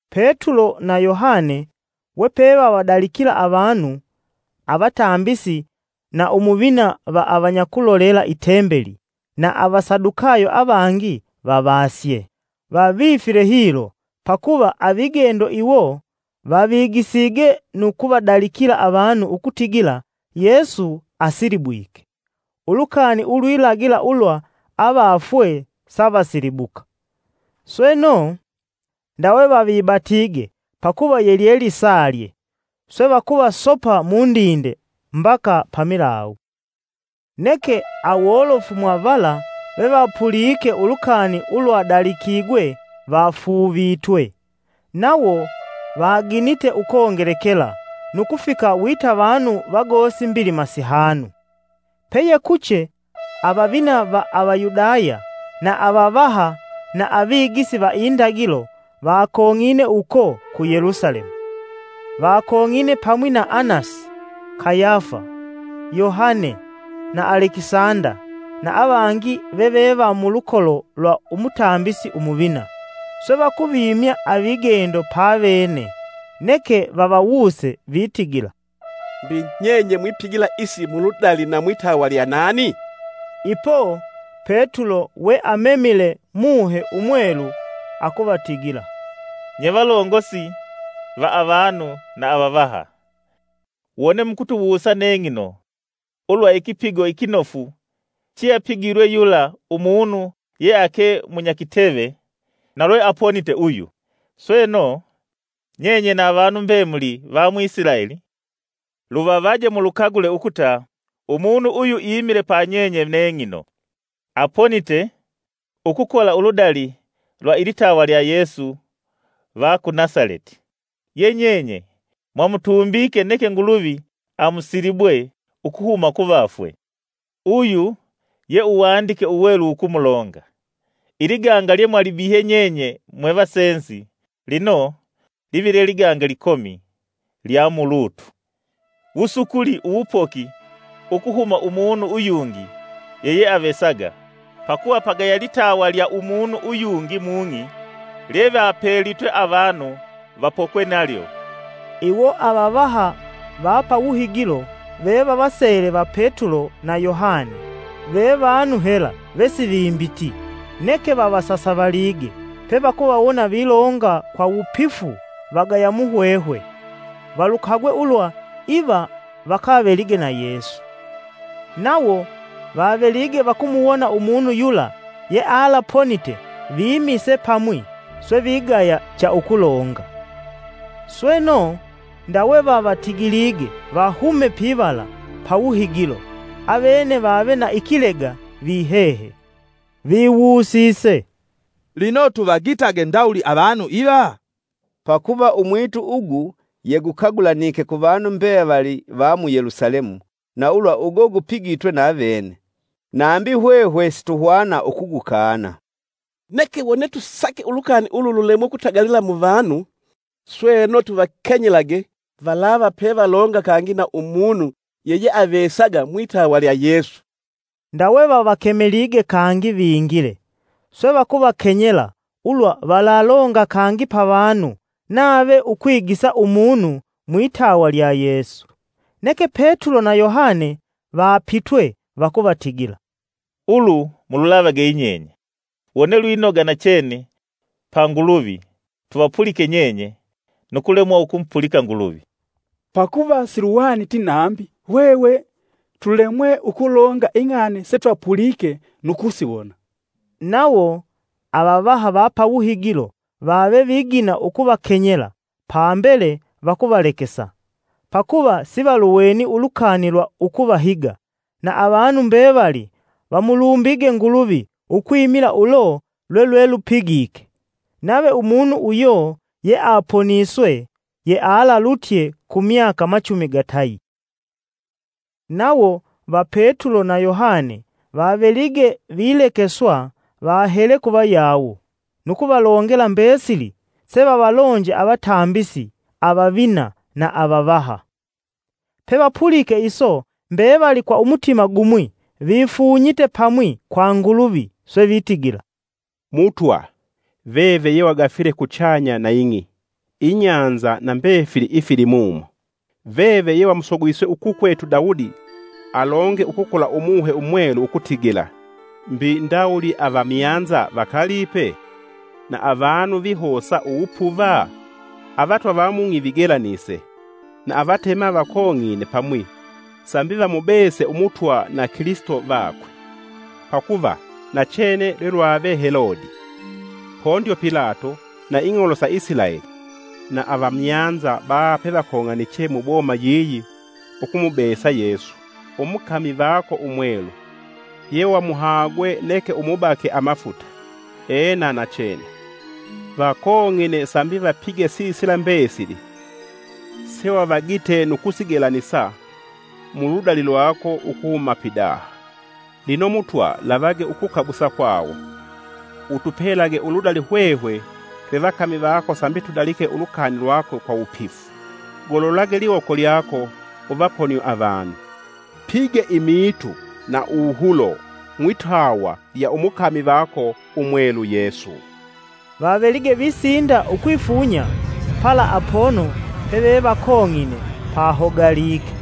Petulo na Yohane wepe vavadalikila avanu, avatambisi na umuvina va avanyakulolela i Tembeli na Avasadukayo avangi vavasye. Vavifile hilo, pakuva avigendo iwo vavigisige nu kuvadalikila avanu ukutigila Yesu asilibwike, ulukani ulwilagila ulwa avafwe savasilibuka. Sweno, ndawe vavibatige pakuva yelyelisalye swe vakuvasopa mundinde mbaka pamilawu. Neke awolofu mwa vala vevapulike ulukani ulwadalikigwe vafuuvitwe, nawo vaginite ukongelekela nu kufika wita vanu vagosi mbilima sihanu. Peyekuche avavina va Avayudaya, na avavaha na avigisi va indagilo vakong'ine uko ku Yelusalemu. Vakong'ine pamwi na Anasi, Kayafa, Yohane, na Alekisanda na avangi veve va mulukolo lwa umutambisi umuvina. Swe vakuvimya avigendo pavene, neke vavawuse vitigila, “Mbi nyenye mwipigila isi muludali na mwitawa lya nani?” Ipo, Petulo we amemile Muhe Umwelu akuvatigila, “Nye valongosi va avanu na avavaha! Wone mukutuwusa neng'ino, ulwa ikipigo ikinofu cheapigilwe yula umunu yeake munyakiteve, na lweaponite uyu, Sweno, nyenye na vanu mbemuli va mu Isilaeli, luvavaje mulukagule ukuta umunu uyu imile pa nyenye neng'ino, aponite, ukukola uludali lwa ilitawa lya Yesu va ku Nasaleti, ye nyenye mwamutumbike neke Nguluvi amusilibwe ukuhuma kuvafwe. Uyu ye uwandike Uwelu wukumulonga: ‘Iliganga lye mwalibihihye nyenye mwe vasenzi, lino live lye liganga likomi lya mu lutu.’ Wusukuli uwupoki ukuhuma umunu uyungi yeyeavesaga, pakuva pagaya litawa lya umunu uyungi mung'i lyevapelitwe avanu vapokelwe nalyo.” Iwo avavaha va pa wuhigilo, vevavasele va Petulo na Yohane ve vanu hela vesivimbiti, neke vavasasavalige pevakuvawona vilonga kwa wupifu vagaya muhwehwe. Valukagwe ulwa iva vakavelige na Yesu. Nawo vavelige vakumuwona umunu yula yealaponite vimise pamwi, swe vigaya cha ukulonga. Sweno, ndawe vavatigilige vahume pivala pawuhigilo, avene vave na ikilega vihehe. Viwusise, “Lino tuvagitage ndawuli avanu iva? Pakuva umwitu ugu yegukagulanike kuvanu mbevali va mu Yelusalemu, na ulwa ugo gupigitwe navene, nambi hwehwe situhwana ukugukana. Neke wone tusake ulukani ulu lulemwe ukutagalila mu vanu, sweno tuvakenyelage, valava pevalonga kangi na umunu yeyeavesaga mwitawa lya Yesu.” Ndawe vavakemelige kangi vingile, swe vakuvakenyela ulwa valalonga kangi pavanu nave ukwigisa umunu mwitawa lya Yesu. Neke Petulo na Yohane vapitwe vakuvatigila, “Ulu mululavage yinyenye wone lwinoga nachene pa Nguluvi tuvapulike nyenye nu kulemwa ukumupulika Nguluvi. Pakuva siluhwaniti nambi hwehwe tulemwe ukulonga ing'ani setwapulike nu kusiwona.” Nawo, avavaha va pa wuhigilo vave vigina ukuvakenyela, pambele vakuvalekesa. Pakuva sivaluweni ulukani lwa ukuvahiga, na avanu mbevali vamulumbige Nguluvi, ukwimila ulo lwelwelupigike. Nave umunu uyo yeaponiswe yealalutye ku myaka machumi gatayi. Nawo va Petulo na Yohane vavelige vilekeswa, vahele kuvayawo, nu kuvalongela mbesili sevavalonje avatambisi avavina na avavaha. Pevapulike iso mbevali kwa umutima gumwi vifunyite pamwi kwa Nguluvi swe vitigila, “Mutwa veve ye wagafile kuchanya na ing'i, ibahali na mbefili ifilimumo! Veve ye wamsogwise ukukwetu Daudi alonge ukukola Umuhe Umwelu ukutigila; ‘Mbi ndawuli avamyanza vakalipe? Na avanu vihosa uwupuva? Avatwa va mung'i vigelanise, na avatema vakong'ine pamwi sambi vamubese Umutwa na Kilisito vakwe.’ “Pakuva, nachene lwelwave Helodi, Pondyo Pilato, na ing'olo sa Isilaeli na avamyanza baha pevakong'aniche muboma yiyi ukumubesa Yesu umukami vako Umwelu, yewamuhagwe neke umubake amafuta. Ena, nachene, vakong'ine sambi vapige sisila mbesili, sewavagite nu kusigelanisa mu ludali lwako, ukuhuma pidaha. Lino Mutwa lavage ukukabusa kwawo. Utupelage uludali hwehwe twe vakami vako sambi tudalike ulukani lwako kwa wupifu. Gololage liwoko lyako uvaponie avanu. Pige imiitu na uwuhulo mwitawa lya umukami vako Umwelu Yesu.” Vavelige visinda ukwifunya, pala apono pevevakong'ine, pahogalike,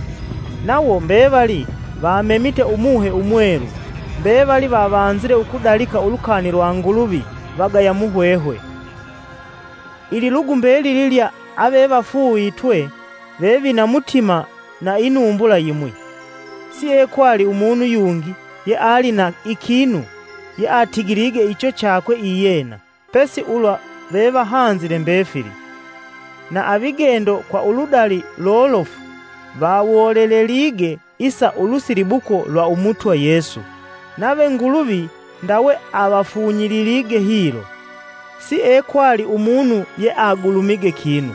nawo mbevali vamemite Umuhe Umwelu. Mbevali vavanzile ukudalika ulukani lwa Nguluvi vagaya muhwehwe. Ililugu mbelili lya avevafuuvitwe vevina mutima na inumbula yimwi. Siekwali umunu yungi yeali na ikinu yeatigilige icho chakwe iyena, pesi ulwa vevahanzile mbefili. Na avigendo kwa uludali lolofu vawolelelige isa ulusilibuko lwa Umutwa Yesu, nave Nguluvi ndawe avafunyililige hilo. Siekwali umunu yeagulumige kinu,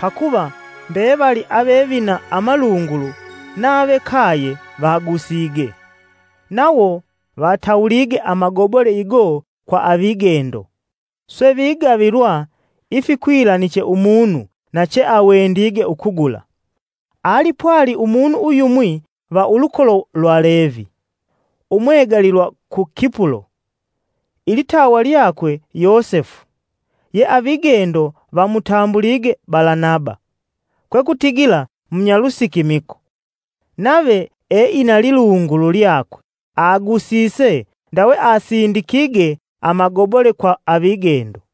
pakuva mbevali avevina amalungulu nave kaye vagusige. Nawo vatawulige amagobole igo kwa avigendo, swe vigavilwa ifikwilaniche umunu na cheawendige ukugula. Alipwali umunu uyumwi va ulukolo lwa Levi, umwegalilwa ku Kipulo, ilitawa lyakwe Yosefu, ye avigendo vamutambulige Balanaba (kwekutigila, “Mnyalusikimiko”). Nave eina lilungulu lyakwe, agusise ndawe asindikige amagobole kwa avigendo.